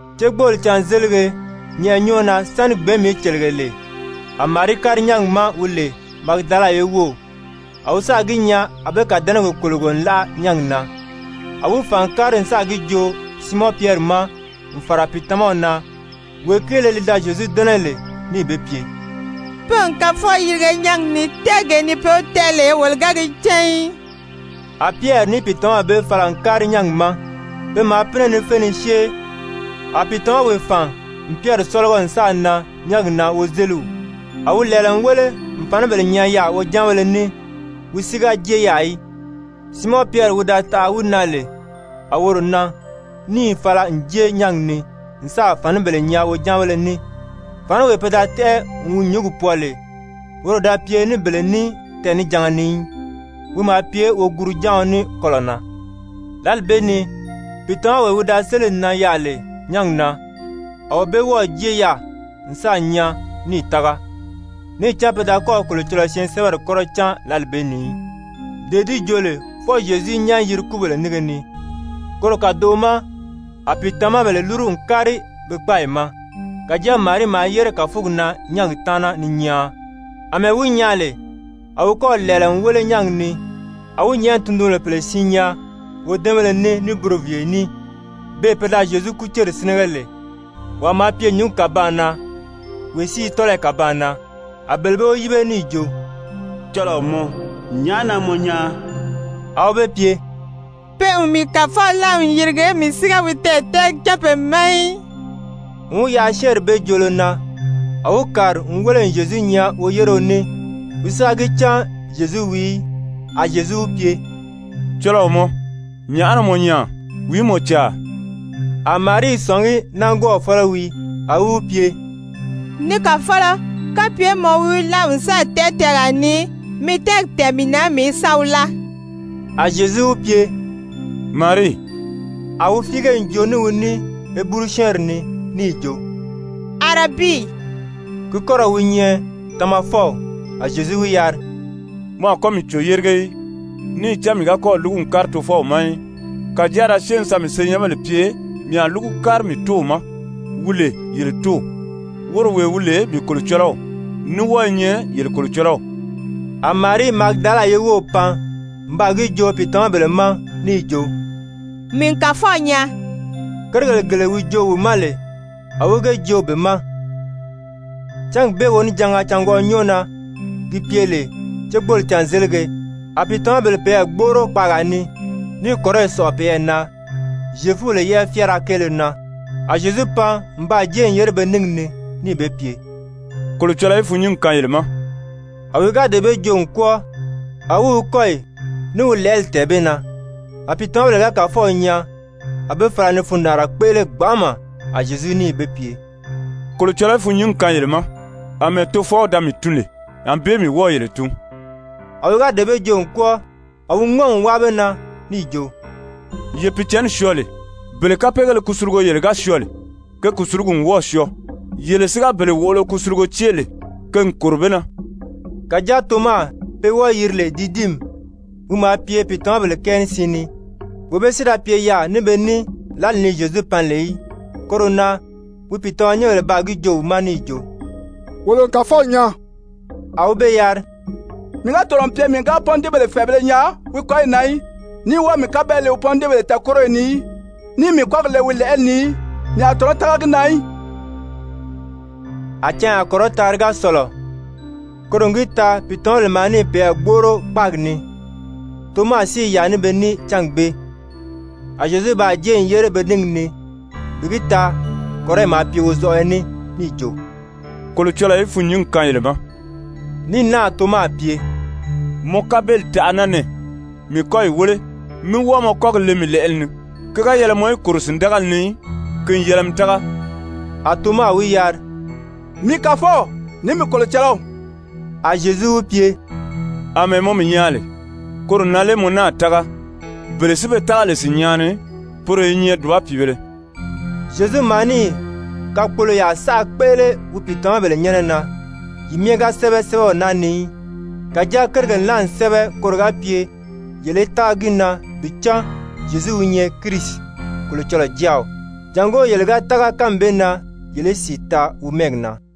Cégbooli cânzélige nyɛʔɛ nyɔ́ɔ na sáni gbɛ̀ɛ́nmi í cèlege lè, a Marii kári nyángi ma wi lè Magidala ye wów. A wi sáà gi nyaa a be kàdɛnɛgi kòlogo n láʔa nyángi na. A wi fàn n kári n sáà gi joo Siimɔn Pyɛri ma n fàra pìitamaw na, wee kéele li da Zyezu dɛ́nɛ lè, níì be pye: «Pe n Kàfɔw yirige nyángi ni, tɛ́ɛgee ni be wi tɛ́ʔɛ lè, wolo ga gi cán í.» A Pyɛri ní pìitamaw bee fala n kári nyángi ma. Pe maa pínɛ ni fé ni syée. A pìitamawee fàn n Pyɛri sɔ́lɔgɔ n sáà nan nyángi na wozeliw. A wi lɛ̀ɛlɛ n wéle n fànibèle nyaa yaà wojáanbéle ní, wi si ga jée yaà í. Siimɔn Pyɛri wi da taʔa wi na lè a woro nan níì fala n jée nyángi ni n sáà fànibèle nyaa wojáanbéle ní. Fàniwee pe da tɛ́ʔɛ n wi nyúngi pwɔɔ lè, woro da pye ní bele ní tɛɛnijanga ni í, wi maa pye woguru-jáaɔn ní kɔlɔ̀ na. Lǎli bee ni pìitamawee wi da sélì nan yaà lè nyángi na, a wee bee wɔ́ɔ̀ jée yaà n sáà nyaa níì tága. Níì cán pe da kɔ́ɔ̀ Kolocɔlɔɔ syɛɛnsɛbɛri kɔ́rɔ cán lǎli bee ni í, dee di joo lè fwɔɔ Zyezu í nyán yiri kúbèle nínge ni. Koro kàdoʔo ma a pìitamabèle lúru n kári be kpáayi ma. Kàjáa Marii maa yére kàfugi na nyángi taana ni nyaan. Amɛɛ wi nyaan lè, a wi kɔ́ɔ̀ lɛ̀ɛlɛ n wéle nyángi ni, a wi nyɛ̀ʔɛni tundunbèle pèle siin nyaa wodɛ́ɛnbéle ní ní buroviiye ní, beè pe da Zyezu kúceri sínɛgɛ lè, wàa maa pye nyǔngi kàbaan na, wee si i nyɛ tɔ́lɔyi kàbaan na. A bele bee wi yíbe níì jo: «Cɔlɔɔ mɔ, nyàʔá na mɔ nyaan?» A wi be pye: «Pe n mii Kàfɔw láa n yirige, mii si ga wi tɛɛ̀tɛʔɛgi cán be ma í.» N wi yaʔa syɛ́ɛnri bee joolo na, a wi kàri n wéle n Zyezu nyaa woyéreo ní, wi si ga cán Zyezu wii í. A Zyezu wi pye: «Cɔlɔɔ mɔ, nyàʔá na mɔ nyaan? Wìí mɔ caa?» A Marii i sɔ̀ngí nángwɔɔw fɔ́lɔ wii, a wi wi pye: «Ni kàfɔlɔ, kapye mɔ wi wi láa n sáà tɛ́ʔɛ tɛɛgaa ni, mi tɛ́ɛgi tɛ̀ɛn mii na, mii í sa wi láa.» A Zyezu wi pye: «Marii.» A wi fíige n joo ní wi ní Heburu-syɛ́ɛnri ni níì jo: «Arabii,» (ki kɔ́rɔw wi nyɛ, Tamafɔw.) A Zyezu wi yari: «Mɔ a kɔ́ mii cǒ yérige í, níì cán mii ga kɔ́ɔ̀ lúgu n kári Tofɔw ma í. Kàjáa da syée mi sa mii senyɛnbèle pye: Mii a lúgu kári mii Tóow ma, wi lè yele Tóow, woro wee wi lè mii Kolocɔlɔw, ní wɔ́ɔ i nyɛ yele Kolocɔlɔw.» A Marii Magidala ye wów pan n baa gi joo pìitamabèle ma níì jo: «Mii n Kàfɔw nyaa.» Kérigèle gele wi joo wi ma lè, a wi ge joo be ma. Cángi bee wonijanga cângwɔʔɔ nyɔ́ɔ na, gi pye lè cégbooli cânzelige, a pìitamabèle peyɛɛ gbóʔoro kpaagaa ni níì kɔ̀riyi sɔ̀ʔɔ peyɛɛ na Zyefubèle yɛ́ʔɛ fyáara kéele na. A Zyezu pan n baa jée n yére be níngi ni níì be pye: «Kolocɔlɔɔ í fûnnyingi kaan yele ma!» A wi ga dee bee joo n kwɔ́ɔ, a wi wi kɔ́yi ní wi lɛ̀ʔɛli tɛ̀ɛn be na. A pìitamabèle ga Kàfɔw nyaa, a be fala ni fundaanra kpéʔele gbanʔama. A Zyezu níì be pye: «Kolocɔlɔɔ í fûnnyingi kaan yele ma! Amɛɛ Tofɔw da mii tun lè, ànbée mii wɔ́ɔ̀ yele tun.» A wi ga dee bee joo n kwɔ́ɔ, a wi ŋɔ́n n wáa be na níì jo: «Ye Pìicǎnni syɔɔ lee. Bele kapeegéle kusulugo yele ga syɔɔ lè, ke kùsulugi n wɔ́ɔ̀ syɔɔ. Yele si ga bele wòʔolo kusulugo cée lè, ke n kòro be na.» Kàjáa Toma pe wɔ́ɔ̄ yiri lè Didimi, wi maa pye pìitamabèle kɛɛ ní siin ni, wee bee si da pye yaà ní be ní lǎli ni Zyezu pan lè í. Koro na wi pìitamanyɛnbèle baa gi joo wi ma níì jo: «Wolo n Kàfɔw nyaa.» A wi be yari: «Mii ga tɔ̀nɔ n pye mii ga pɔ́ndiibèle fɛ̀ɛbēle nyaa wi kɔ́yi na í, ní wɔ́ɔ̀ mii kabeli le pɔ́ndiibèle tɛɛ̀kóriyo ni í, níì mii kɔ́gi le wi lɛ̀ʔɛli ni í, mii a tɔ̀nɔ́ tága gi na í.» A canya kɔrɔtaanri ga sɔ̀lɔ, koro n gi taa pìitamabèle maa níì peyɛɛ gbóʔoro kpáagi ni, Toma si i yaà ní be ní cángi bee. A Zyezu baa jée n yére be níngi ni bi gi taa kɔ̀riyi maa pye wozɔʔɔyɔ ní, níì jo: «Kolocɔlɔɔ í fûnnyingi kaan yele ma!» Ní náà Toma pye: «Mɔ kabeli taʔa naa nɛɛ, mii kɔ́yi wéle, mí wɔ́ɔ mɔ kɔ́gi le mii lɛ̀ʔɛli ni. Ki ga yɛlɛ mɔ í kòro sìndagali ni í, ki n yɛlɛ mi tága!» A Toma wi yari: «Mii Kàfɔw, ní mii Kolocɔlɔw!» A Zyezu wi pye: «Amɛɛ mɔ mii nyaa lè, koro na lé mɔ náà tága? Bele si be tága lè sìnnyaa ni, poro i nyɛ dùba pìibēle.» Zyezu maa níì kakpoloyaa saʔa kpéʔele wi pìitamabèle nyɛ́nɛ na, yi myɛ ga sɛ́bɛ sɛ́bɛw naa ni í. Kàjáa kérigèle naa n sɛ́bɛ koro ga pye yele í tága gi na, bi cán Zyezu wi nyɛ Kirisi, Kolocɔlɔɔ Jáaw, jàngó yele ga tága kánmi bee na, yele í sìi taa wi mɛ́ɛgi na.